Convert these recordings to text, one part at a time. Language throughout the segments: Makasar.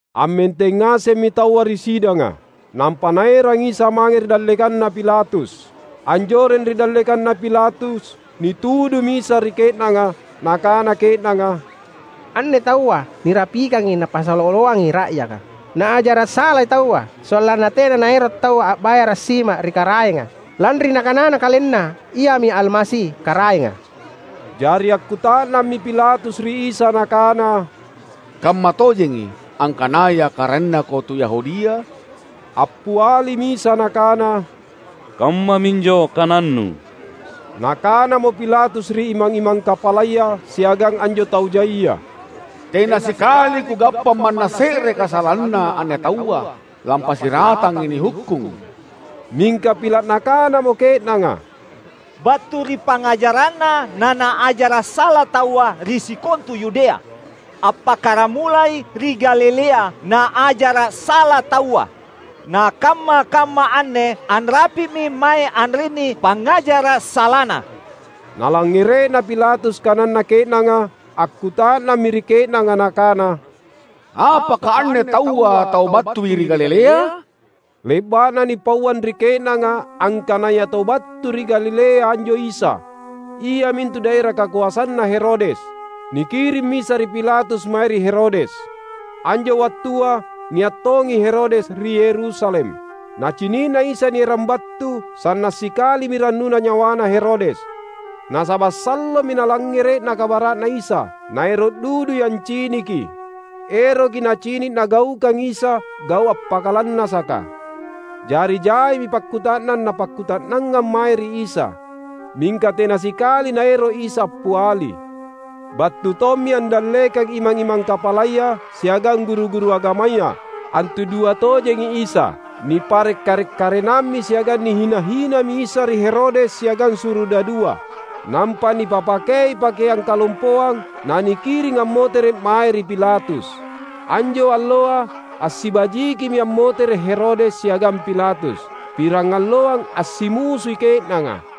Ammenteng ngasemmi taua ri sidanga, nampa naerang Isa mange ri dallekanna Pilatus. Anjoreng ri dallekanna Pilatus, nitudumi Isa ri ke’nanga. Nakana ke’nanga, "Anne taua nirapikangi Napasala oloangi ra’yaka. Naajara’ salai taua sollanna tena naero’ taua a’bayara’ sima ri Karaenga, lanri Nakanana KalenNa Iami Almasi, Karaenga." Jari akkuta’nammi Pilatus ri Isa Nakana, "Kammatojengi, angkanaya karaennaKo tu Yahudia?" Appialimi Isa Nakana, "Kammaminjo kanannu." Nakanamo Pilatus ri imang-imang kapalaya siagang anjo tau jaia, "Tena sikali kugappa manna se’re kasalanna anne taua lampassiratangi nihukkung." Mingka pila’ nakanamo ke’nanga, "Battu ri pangngajara’Na, naNaajara’ sala taua ri sikontu Yudea; appakkaramulai ri Galilea Naajara’ sala taua, na kamma-kamma anne anrapi’mi mae anrinni pangngajara’ salaNa." Nalangngere’na Pilatus kananna ke’nanga, akkuta’nammi ri ke’nanga nakana, "Apaka anne taua tau battui ri Galilea?" Le’ba’na nipauang ri ke’nanga angkanaya tau battui ri Galilea anjo Isa, iamintu daera kakoasanna Herodes, nikirimmi Isa ri Pilatus mae ri Herodes. Anjo wattua nia’ tongi Herodes ri Yerusalem. Nacini’na Isa nierang battu, sanna’ sikalimi rannuna nyawana Herodes. Nasaba’ sallomi nalangngere’na kabara’Na Isa, naero’ dudui anciniki. Eroki nacini’ Nagaukang Isa gau’ appakalannasaka. Jari jaimi pakkuta’nang napakkuta’nangang mae ri Isa. Mingka tena sikali Naero’ Isa appiali. Battu tommi andallekang imang-imang kapalaya siagang guru-guru agamaya, antudua tojengi Isa. Nipare’ karek-karenammi siagang nihina-hinami Isa ri Herodes siagang surudadua. Nampa nipipakei pakeang kalompoang, nanikiring ammotere’ mae ri Pilatus. Anjo alloa assibajikimi ammotere’ Herodes siagang Pilatus. Pirangalloang assimusui ke’nanga.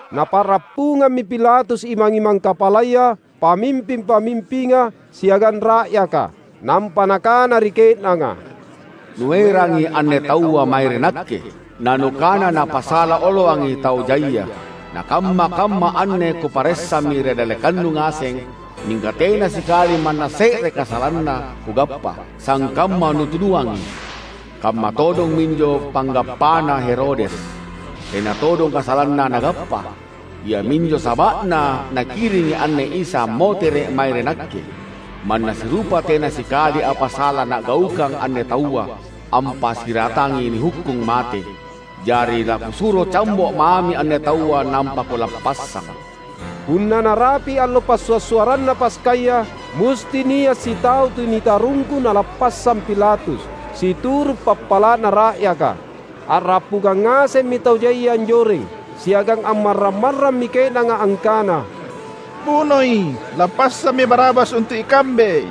Napa’rappungammi Pilatus imang-imang kapalaya, pamimping-pamimpinga, siagang ra’yaka. Nampa nakana ri ke’nanga, "Nuerangi anne taua mae ri nakke, nanukana Napasala oloangi tau jaia. Na kamma-kamma anne kuparessami ri dallekannu ngaseng, mingka tena sikali manna se’re kasalanna kugappa, sangkamma nutuduangi. Kamma todong minjo panggappana Herodes; tena todong kasalanna nagappa. Iaminjo saba’na nakiringi anne Isa ammotere’ mae ri nakke. Manna sirupa tena sikali apa sala nagaukang anne taua, ampassiratangi nihukkung mate. Jari lakusuro cambo’ mami anne taua nampa kulappassang." [Punna narapi' allo Passua'-suarranna Paskaya, musti nia' sitau tu nitarungku nalappassang Pilatus, situru' pappala'na ra'yaka.] A’rappungang ngasemmi tau jaia anjoreng, siagang ammarrang-marrammi ke’nanga angkana, "Bunoi! Lappassammi Barabas untu’ ikambe!"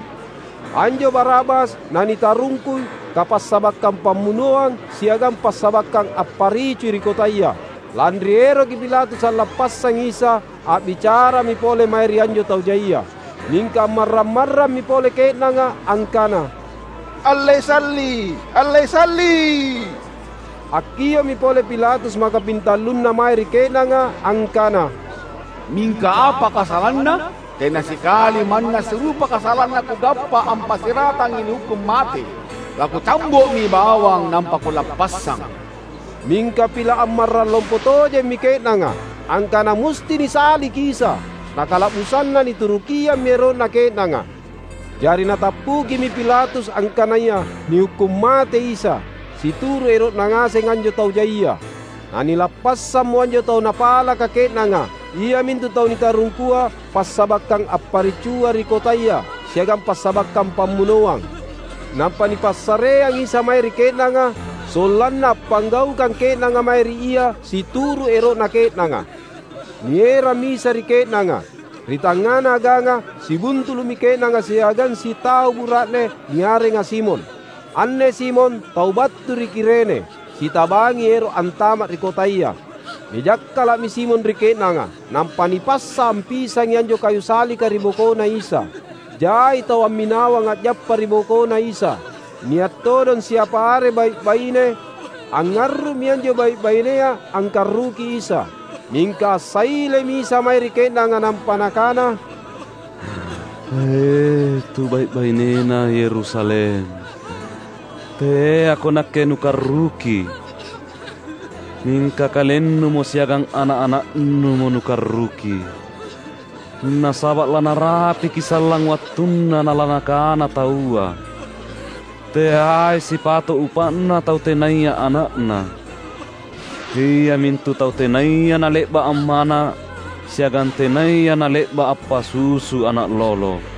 (Anjo Barabas, nanitarungku kapassabakkang pammunoangsiagang passabakkang apparicui ri kotaya.) Lanri eroki Pilatus allappassangi Isa, a’bicarami pole mae ri anjo tau jaia. Mingka ammarrang-marrammi pole ke’nanga angkana, "Allei Salli’! Allei Salli’!" Akkio’mi pole Pilatus makapintallunna mae ri ke’nanga angkana, "Mingka apa kasalanna? Tena sikali manna sirupa kasalanna kugappa ampassiratangi nihukkung mate! Lakucambo’mi bawang nampa kulappassang." Mingka pila’ ammarrang lompo tojemmi ke’nanga, angkana musti nisalliki Isa. Na kala’busanna niturukiammi ero’na ke’nanga. Jari natappukimi Pilatus angkanaya nihukkung matei Isa, situru’ ero’na ngaseng anjo tau jaia. Nanilappassammo anjo tau napalaka ke’nanga, iamintu tau nitarungkua passabakkang apparicua ri kotaya siagang passabakkang pammunoang. Nampa nipassareang Isa mae ri ke’nanga sollanna appanggaukang ke’nanga mae ri Ia situru’ ero’na ke’nanga. Nierammi Isa ri ke’nanga. Ri tangngana aganga, sibuntulu’mi ke’nanga siagang sitau bura’ne, niarenga Simon. Anne Simon tau battu ri Kirene, sitabangi ero’ antama’ ri kotaya. Nijakkala’mi Simon ri ke’nanga, nampa nipassa ampisangi anjo kayu sallika ri bokoNa Isa. Jai tau amminawang a’jappa ri bokoNa Isa — nia’ todong siapa are bai’-baine. Angngarru’mi anjo bai’-bainea angkarruki Isa. Mingka assailemi Isa mae ri ke’nanga, nampa Nakana, "E, tu bai’-bainena Yerusalem! Teako Nakke nukarruki. Mingka kalennumo siagang ana’-ana’numo nukarruki. Nasaba’ lanarapiki sallang wattunna nalanakana taua, ‘Teai sipato’ upa’na tau tenaya ana’na, iamintu tau tenaya nale’ba’ ammana’ siagang tenaya nale’ba’ appasusu ana’ lolo!’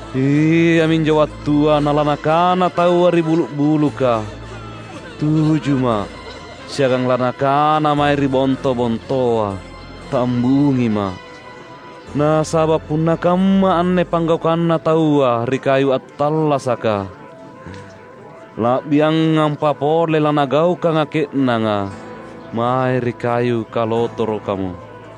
Iaminjo wattua nalanakana taua ri bulu’-buluka, ‘Tujuma’!’ Siagang lanakana mae ri bonto-bontoa, ‘Tambungima’!’ Nasaba’ punna kamma anne panggaukanna taua ri kayu attallasaka, la’biangampa pole lanagaukanga ke’nanga mae ri kayu kalotorokamo!"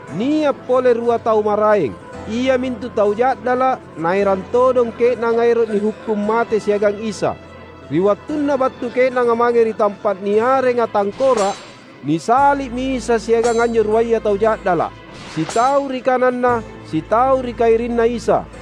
Nia’ pole rua tau maraeng — iamintu tau ja’dala’ — naerang todong ke’nanga ero’ nihukkung mate siagang Isa. Ri wattunna battu ke’nanga mange ri tampa’ niarenga "Tangkora’," nisalli’mi Isa siagang anjo ruaya tau ja’dala’ — sitau ri kanang na sitau ri kairinna Isa.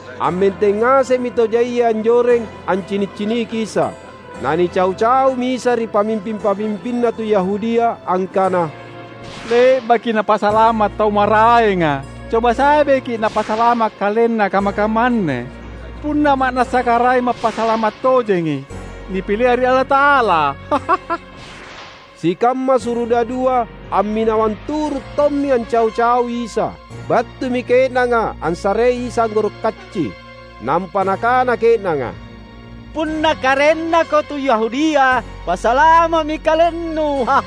Ammenteng ngasemmi tau jaia anjoreng ancini’-ciniki Isa. Na nicau-caumi Isa ri pamimping-pamimpinna tu Yahudia angkana, "Le’baki Napasalama’ tau maraenga; coba sabeki Napasalama’ KalenNa kamma-kamma anne, punna ma’nassa Karaeng Mappasalama’ tojengi, nipilea ri Allata’ala!" Sikamma surudadua amminawang turu’ tommi ancau-caui Isa. Battumi ke’nanga assarei Isa anggoro’ kacci; nampa nakana ke’nanga, "Punna karaennaKo tu Yahudia, pasalama’mi KalenNu!"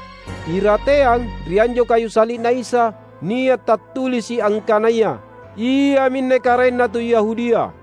Irateang ri anjo kayu salli’Na Isa, nia’ tattulisi’ angkanaya: "Iaminne Karaenna tu Yahudia."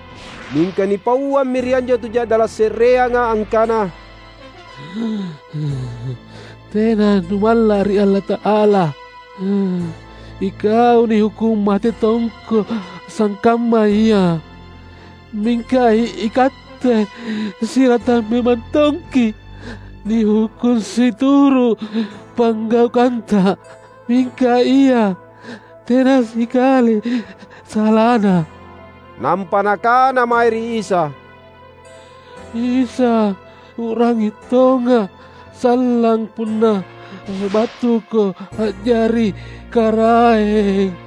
Mingka nipauammi ri anjo tu ja’dala’ se’reanga angkana, "Tena numalla’ ri Allata’ala? Ikau nihukkung mate tongko sangkamma Ia. Mingka ikatte siratang memang tongki’ nihukkung situru’ panggaukanta. Mingka Ia tena sikali salaNa!" Nampa nakana mae ri Isa, "Isa, U’rangi tonga’ sallang punna battuKo a’jari Karaeng!"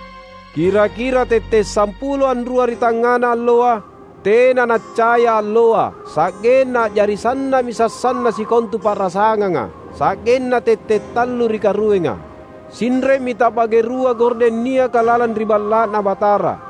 Kira-kira tette’ sampulo anrua ri tangngana alloa, tena naccaya alloa, sa’genna a’jari sanna’mi sassanna sikontu pa’rasanganga, sa’genna tette’ tallu ri karuenga. Sinre’mi ta’bage rua gordeng niaka lalang ri Balla’Na Batara.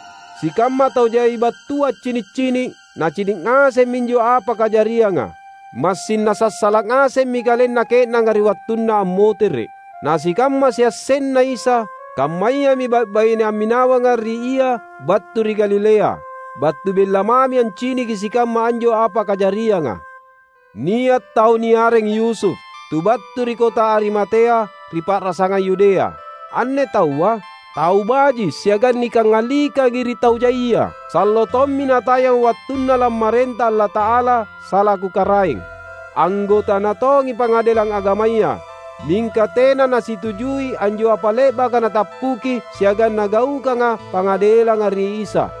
Sikamma tau jai battua accini’-cini’, nacini’ ngasemmi anjo apa kajarianga. Massing nasassala’ ngasemmi kalenna ke’nanga ri wattunna ammotere’. Na sikamma siassenna Isa, kammayami bai’-baine amminawanga ri Ia battu ri Galilea, battu bella mami anciniki sikamma anjo apa kajarianga. Nia’ tau niareng Yusuf, tu battu ri kota Arimatea ri pa’rasangang Yudea. Anne taua, tau baji’ siagang nikangalikangi ri tau jaia. Sallo tommi natayang wattunna lammarenta Allata’ala, salaku Karaeng. Anggotana tongi Pangadelang Agamaya. Mingka tena nasitujui anjo apa le’baka natappuki siagang nagaukanga pangadelanga ri Isa.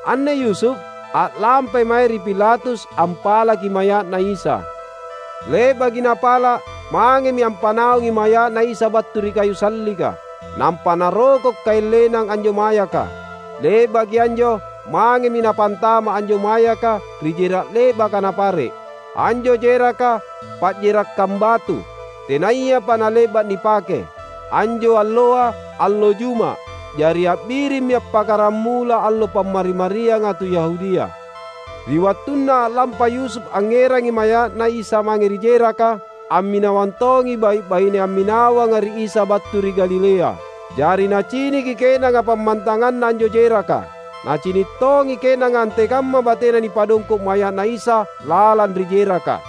Anne Yusuf, a’lampai mae ri Pilatus ampalaki maya’Na Isa. Le’baki napala’, mangemi ampanaungi maya’Na Isa battu ri kayu sallika. Nampa naroko’ kaeng lenang anjo mayaka. Le’baki anjo, mangemi napantama’ anjo mayaka ri jera’ le’baka napare’. Anjo jeraka, pajerakkang batu, tenayapa nale’ba’ nipake. Anjo alloa, allo Juma’; jari a’birimmi appakkaramula allo Pammari-marianga tu Yahudia. Ri wattunna a’lampa Yusuf angngerangi maya’Na Isa mange ri jeraka, amminawang tongi bai’-baine amminawanga ri Isa battu ri Galilea. Jari naciniki ke’nanga pammantanganna anjo jeraka. Nacini’ tongi ke’nanga antekamma batena nipadongko’ maya’na Isa lalang ri jeraka.